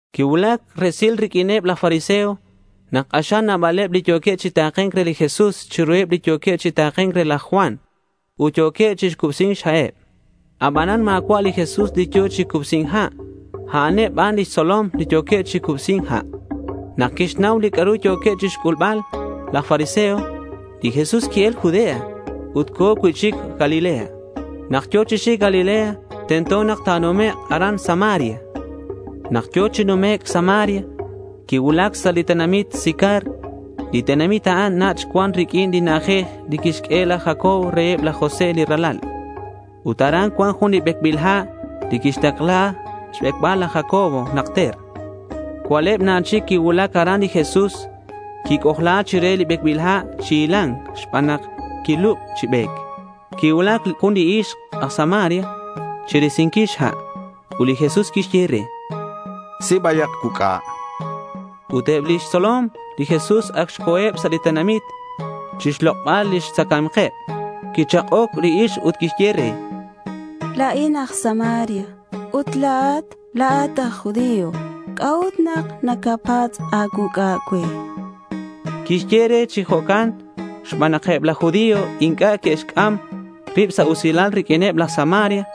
Quicuulac resil riq'uineb laj fariseo nak k'axal nabaleb li yo̱queb chi take̱nc re li Jesús chiruheb li yo̱queb chi take̱nc re laj Juan ut yo̱queb chi cubsi̱c xha'eb. Abanan ma̱cua' li Jesús li yo̱ chi cubsi̱nc ha'. A'aneb ban lix tzolom li yo̱queb chi cubsi̱nc ha'. Nak quixnau li c'a'ru yo̱queb chixyebal laj fariseo, li Jesús qui-el Judea ut co̱ cui'chic Galilea. Nak yo̱ chi xic Galilea, tento nak ta̱numek' aran Samaria. Nak yo̱ chi numec' Samaria, quicuulac sa' li tenamit Sicar. Li tenamit a'an nach' cuan riq'uin li na'ajej li quixq'ue laj Jacob re laj José li ralal. Ut aran cuan jun li becbil ha' li quixtakla xbecbal laj Jacob najter. Cua'leb na chic quicuulac aran li Jesús. Quic'ojla chire li becbil ha' chi hila̱nc xban nak quilub chi be̱c. Quicuulac jun li ixk aj Samaria chirisinquil xha'. Ut li Jesús quixye re: —Si bayak cuuc'a, chan. Ut eb lix tzolom li Jesús ac xco̱eb sa' tenamit chixlok'bal lix tzacae̱mkeb. Quichak'oc li ixk ut quixye re: —La̱in aj Samaria ut la̱at, la̱at aj judío. ¿C'a'ut nak nacapatz' a̱cuuc'a cue? chan. Quixye re chi jo'can xban nak eb laj judío inc'a' neque'xc'am rib sa' usilal riq'uineb laj Samaria.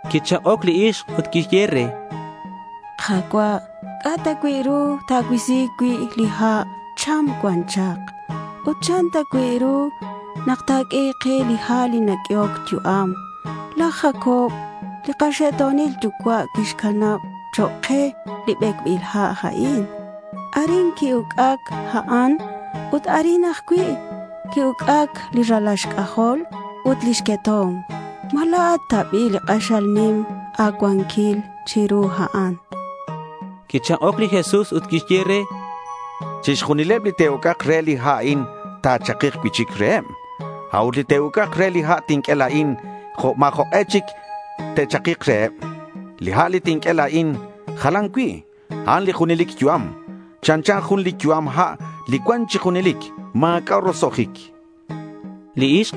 Quichak'oc li ixk ut quixye re: —Ka̱cua', ¿C'a' ta cui' ru ta̱cuisi cui' li ha'? Cham cuan chak. Ut, ¿chan ta cui' ru nak ta̱q'ue li ha' li naq'uehoc yu'am? Laj Jacob li kaxe'to̱nil yucua' quixcanab chok' ke li becbil ha' a'in. Arin qui-uc'ac a'an ut arin ajcui' que'uc'ac li ralal xc'ajol ut lix queto̱mk. ¿Ma la̱at ta bi' k'axal nim a̱cuanquil chiru a'an? chan li ixk. Quichak'oc li Jesús ut quixye re: —Chixjunileb li te'uc'ak re li ha' a'in, ta̱chakik cui'chic reheb. A'ut li te'uc'ak re li ha' tinq'ue la̱in, ma̱ jok'e chic ta̱chakik reheb. Li ha' li tinq'ue la̱in jalan cui'. A'an li junelic yu'am. Chanchan jun li yu'am ha' li cuan chi junelic. Ma̱c'a' roso'jic, chan li Jesús.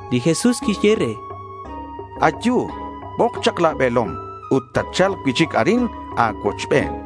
Li Jesús quixye re: —Ayu. Bok chak la̱ be̱lom ut tatcha̱lk cui'chic arin a̱cuochben, chan.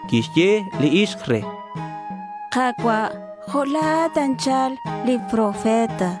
Quixye li ixk re: —Ka̱cua', jo' li la̱at anchal profeta.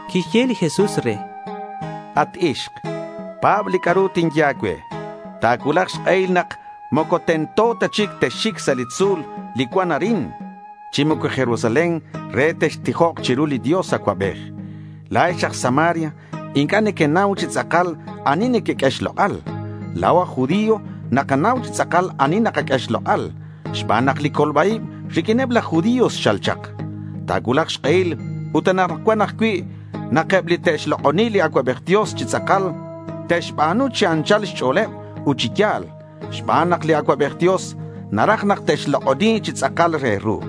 Quixye li Jesús re: —At ixk, pa̱b li c'a'ru tinye a̱cue. Ta̱cuulak xk'ehil nak moco tento ta chic texxic sa' li tzu̱l li cuan arin, chi moco Jerusalén re textijok chiru li Dios Acuabej. La̱ex aj Samaria inc'a' nequenau chi tz'akal ani nequeq'ue xlok'al. La̱o aj judío nakanau chi tz'akal ani nakaq'ue xlok'al xban nak li colba-ib riq'uineb laj judío xchal chak. Ta̱cuulak xk'ehil, ut anakcuan ajcui', nak eb li te'xlok'oni li Acuabej Dios chi tz'akal, te'xba̱nu chi anchal xch'o̱leb ut chi ya̱l xban nak li Acuabej Dios naraj nak te'xlok'oni chi tz'akal re ru.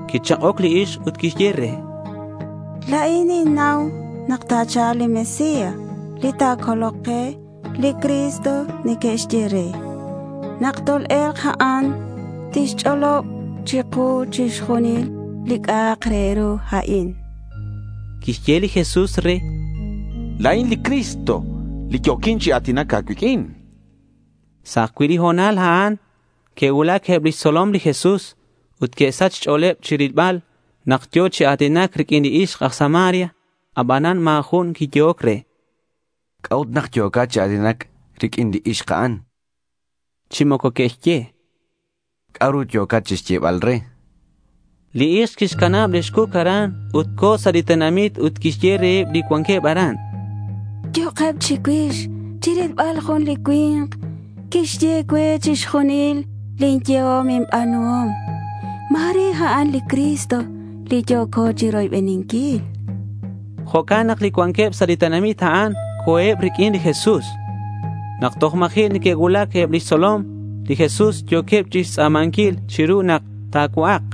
Quichak'oc li ixk ut quixye re: —La̱in ninnau nak ta̱cha̱lk li Mesías li ta̱colok ke. Li Cristo neque'xye re. Nak tol-e̱lk a'an, tixch'olob chiku chixjunil li c'a'ak re ru a'in, chan li ixk. Quixye li Jesús re: —La̱in li Cristo li yo̱quin chi a̱tinac a̱cuiq'uin, chan. Sa' ajcui' li ho̱nal a'an, que'cuulac eb lix tzolom li Jesús. Ut que'sach xch'o̱leb chirilbal nak yo̱ chi a̱tinac riq'uin li ixk aj Samaria. Abanan ma̱ jun quiyehoc re: —¿C'a'ut nak yo̱cat chi a̱tinac riq'uin li ixk a'an?— Chi moco que'xye: —¿C'a'ru yo̱cat chixyebal re?— Li ixk quixcanab lix cuc aran ut co̱ sa' li tenamit ut quixye reheb li cuanqueb aran: —Yo'keb chicuix chirilbal jun li cui̱nk quixye cue chixjunil lin yehom inba̱nuhom. Ma̱re a'an li Cristo li yo̱co chiroybeninquil, chan. Jo'can nak li cuanqueb sa' li tenamit a'an co̱eb riq'uin li Jesús. Nak toj ma̱ji' neque'cuulac, eb lix tzolom li Jesús yo̱queb chixtz'a̱manquil chiru nak ta̱cua'ak.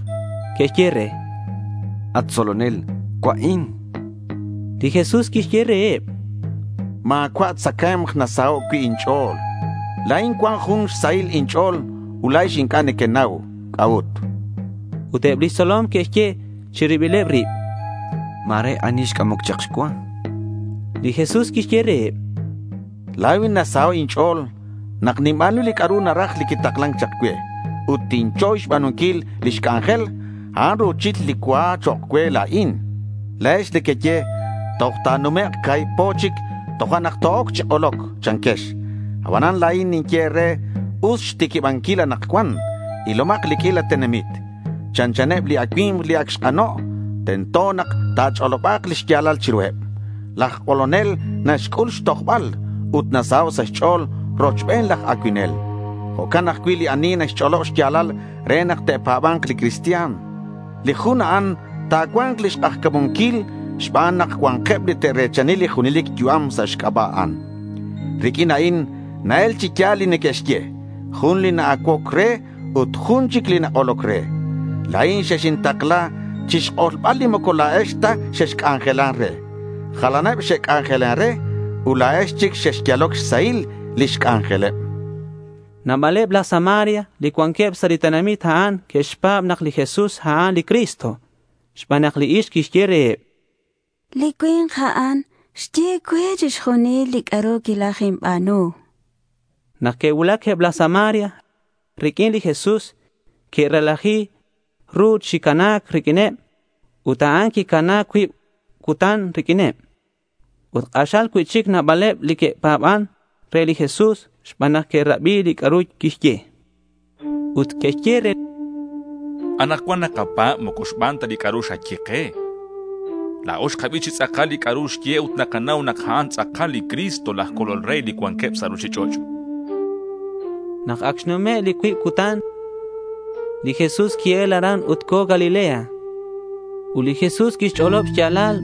Que'xye re: —At tzolonel, cua'in, chanqueb re. Li Jesús quixye reheb: —Ma̱cua' tzacae̱mk nasaho' cui' inch'o̱l. La̱in cuan jun xsahil inch'o̱l ut la̱ex inc'a' nequenau c'a'ut, chan. Ut eb lix tzolom que'xye chi ribileb rib: —Ma̱re ani xc'amoc chak xcua, chanqueb. Li Jesús quixye reheb: —La̱in nasaho' inch'o̱l nak ninba̱nu li c'a'ru naraj li quitaklan chak cue ut tinchoy xba̱nunquil lix c'anjel. A'an ru̱chil li cua chok' cue la̱in, chan. La̱ex nequeye, “Toj ta̱numek' ca̱hib po chic tojo'nak to-oc chi k'oloc”, chanquex. Abanan la̱in ninye e̱re us xtiquibanquil anakcuan. Ilomak li q'uila tenamit. Chanchaneb li acui̱mk li ac xk'ano'. Tento nak ta̱ch'oloba̱k li xya̱lal chiruheb. Laj k'olonel naxc'ul xtojbal ut nasaho' sa' xch'o̱l rochben laj acuinel. Jo'can ajcui' li ani naxch'olob xya̱lal re nak te'pa̱ba̱nk li cristian. Li jun a'an ta̱cua̱nk lix k'ajca̱munquil xban nak cua̱nkeb li te're̱chani li junelic yu'am sa' xc'aba' a'an. Riq'uin a'in na-el chi ya̱l li neque'xye: Jun li na-acuoc re ut jun chic li nak'oloc re. La̱in xexintakla chixk'olbal li moco la̱ex ta xexc'anjelan re. Jalaneb xe'c'anjelan re ut la̱ex chic xexyaloc xsahil lix c'anjeleb, chan li Jesús reheb. Nabaleb laj Samaria li cuanqueb sa' li tenamit a'an que'xpa̱b nak li Jesús a'an li Cristo, xban nak li ixk quixye reheb: —Li cui̱nk a'an xye cue chixjunil li c'a'ru quilajinba̱nu.— Nak que'cuulac eb laj Samaria riq'uin li Jesús, que'relaji ru chi cana̱c riq'uineb. Ut a'an quicana cuib cutan riq'uineb. Ut k'axal cui'chic nabaleb li que'pa̱ban re li Jesús xban nak que'rabi li c'a'ru quixye. Ut que'xye re li ixk: —Anakcuan nakapa̱b, moco xban ta li c'a'ru xaye ke. La̱o xkabi chi tz'akal li c'a'ru xye ut nakanau nak a'an tz'akal li Cristo laj Colol re li cuanqueb sa' ruchich'och', chanqueb. Nak ac xnume' li cuib cutan, li Jesús qui-el aran ut co̱ Galilea. Ut li Jesús quixch'olob xya̱lal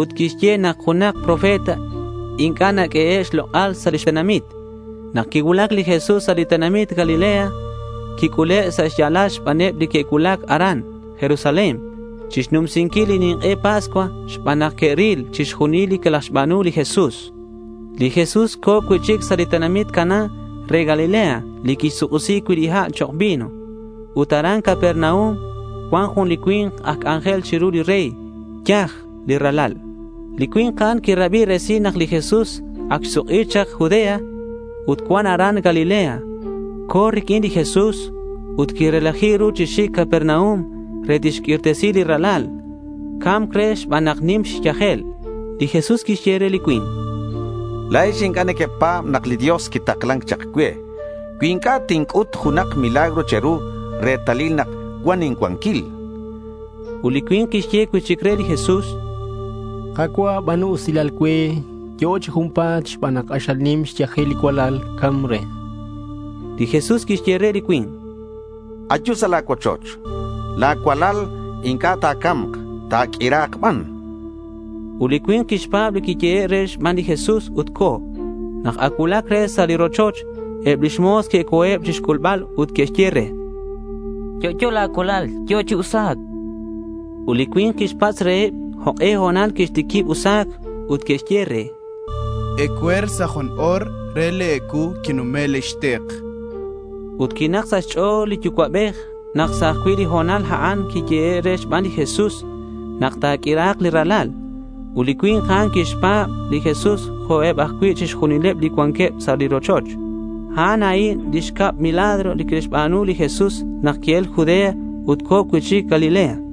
ut quixye nak junak profeta inc'a' naq'uehe' xlok'al sa' lix tenamit. Nak quicuulac li Jesús sa' li tenamit Galilea, quic'ule' sa' xya̱lal xbaneb li que'cuulac aran Jerusalén chixnumsinquil li nink'e Pascua xban nak que'ril chixjunil li quilajxba̱nu li Jesús. Li Jesús co̱ cui'chic sa' li tenamit Caná re Galilea li quixsuk'isi cui' li ha' chok' vino. Ut aran Capernaum cuan jun li cui̱nk aj c'anjel chiru li rey. Yaj li ralal. Li cui̱nk a'an quirabi resil nak li Jesús ac xsuk'i chak Judea ut cuan aran Galilea. Co̱ riq'uin li Jesús ut quirelaji ru chi xic Capernaum re tixq'uirtesi li ralal. Ca̱mc re xban nak nim xyajel. Li Jesús quixye re li cui̱nk: —La̱ex inc'a' nequepa̱b nak li Dios quitaklan chak cue cui inc'a' tinc'ut junak milagro che̱ru retalil nak cuan incuanquil, chan. Ut li cui̱nk quixye cui'chic re li Jesús: —Ka̱cua', ba̱nu usilal cue. Yo'o chi junpa̱t xban nak k'axal nim xyajel li cualal. Ca̱mc re, chan li cui̱nk. Li Jesús quixye re li cui̱nk: —Ayu sa' la̱ cuochoch. La̱ cualal inc'a' ta̱ca̱mk. Ta̱q'uira̱k ban, chan. Ut li cui̱nk quixpa̱b li quiyehe' re xban li Jesús ut co̱. Nak ac cuulac re sa' li rochoch, eb lix mo̱s que'co̱eb chixc'ulbal ut que'xye re: —Yo'yo la̱ cualal. Yo̱ chi usa̱c, chanqueb re. Ut li cui̱nk quixpatz' reheb jok'e ho̱nal quixtiquib usa̱c. Ut que'xye re: —Ecue̱r sa' jun o̱r re li ecuu quinume' lix tik, chanqueb re. Ut quinak sa' xch'o̱l li yucua'bej nak sa' ajcui' li ho̱nal a'an quiyehe' re xban li Jesús nak ta̱q'uira̱k li ralal. Ut li cui̱nk a'an quixpa̱b li Jesús jo'queb ajcui' chixjunileb li cuanqueb sa' li rochoch. A'an a'in li xcab milagro li quixba̱nu li Jesús nak qui-el Judea ut co̱ cui'chic Galilea.